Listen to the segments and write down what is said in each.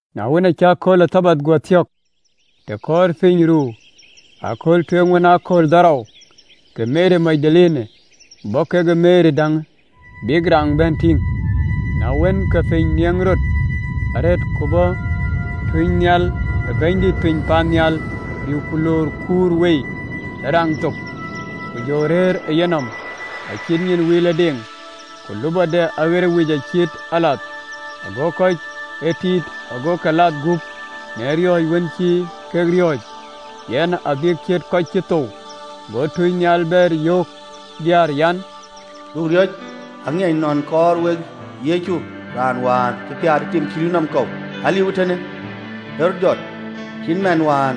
Na wën, aacï akööl ë Thabath guɔ thök, të kɔɔrë piny ruu ëkööl tueŋ wën aa kööl dhorou, ke Meri Magdalene bɔ̈ kekë Meri däŋ, bïk raŋ bɛ̈n tïŋ. Na wën, ke piny nieŋ rɔt arëët, ku bɔ̈ tunynhial ë Bɛ̈nydït piny paannhial, bï ku lɔɔr kuur wei ë raŋ thok, ku jɔ rëër ë yenɔm. Acït nyin wilëdeŋ, ku lupɔde aɣer ë wic cït alath, ago kɔc ë tïït ago ke lath gup në riɔ̈ɔ̈c wën cï kek riɔ̈ɔ̈c ë yen, abïk ciët kɔc cï thou. Go tunynhial bɛ̈ɛ̈r, yöök diäär an, “Duökï riɔ̈c, aŋiɛc nɔn kaar wek Yecu, raan wään cï piäät ë tim cï rïïu nɔm kɔ̈u. Aliu ee tënë, ë rɔt jɔt cït man wään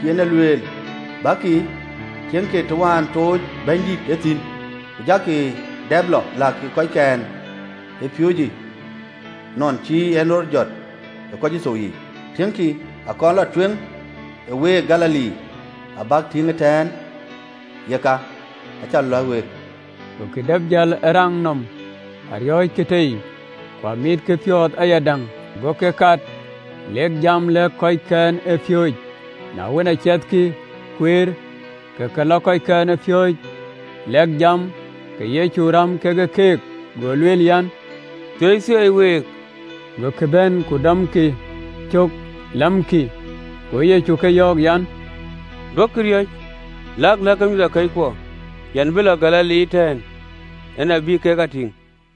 cï en e lueel. Bäkï, tiëŋkï të wään tɔ̈ɔ̈cë Bɛ̈nydït thïn. Ku jakï dap lɔ, lɛ̈kkï kɔckɛn ë piööcë, ‘nɔn cï en rɔt jɔt ë kɔc cï thou yiic, ku tiëŋkï, akɔn lɔ tueŋ ë week Galili, abäk lɔ tïŋ ëtɛ̈ɛ̈n!’ Takï kë cä lɛ̈k week.” Gokï dap jäl ë raŋ nɔm, ariɔ̈ckï tei, ku amitkï piɔ̈ɔ̈th ayadäŋ, gokï kat lek jam lëk kɔckɛn ë piööcë. Na wën, aa ciɛthkï kueer, ke ke lɔ kɔckɛn ë piööcë lɛ̈k jam, ke Yecu ë räm ke keek, go lueel an, “Thieitheei ë week!” Gokï bɛ̈n ku dɔmkï cök, lamkï. Go Yecu ke yɔ̈ɔ̈k an, “Duökï riɔ̈c, lak lɛ̈kkï mïthëkɔckuɔ an, bïk lɔ Galili, tɛ̈ɛ̈n en abï kek a tïŋ.”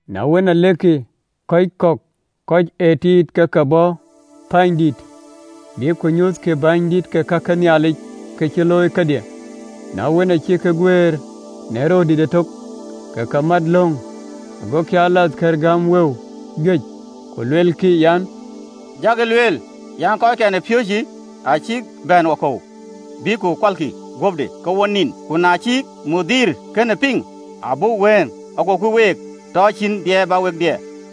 Na wën, alekkï, ke kɔc kɔ̈k ë kɔc ë tïït ke ke bɔ̈ pänydït, bïk ku nyuthkï bänydït ke ka ke Nhialic ka cï röt looi kedhie. Na wën, aa cïk guëër në röördït ëtök, ke ke mat löŋ, gokï alathkëër gäm wëu juëc, ku luelkï an, “Jakï lueel an, kɔckɛn ë piööcë acïk bɛ̈n wakɔ̈u, bïkkï ku kualkï guöpde, ke wo nin. Ku na cï bɛ̈ny kënë piŋ, abuk wëŋ, agoku week tɔ cïn diɛɛr bä wek diɛɛr.”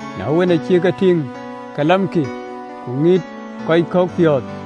Na wën, aa cïk e tïŋ, ke lamkï, ku ŋït kɔc kɔ̈k piɔ̈ɔ̈th.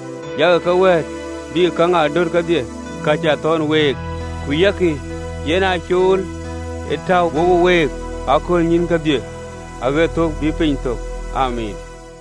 ku yak keek wɛ̈ɛ̈t, bïk käŋ aa döt kedhie ka cä thɔ̈n week, ku ya kï, yɛn ee cool ë tɔ̈u wo week ë aköölnyïïn kedhie, aɣët thök bï piny thök. Amiin.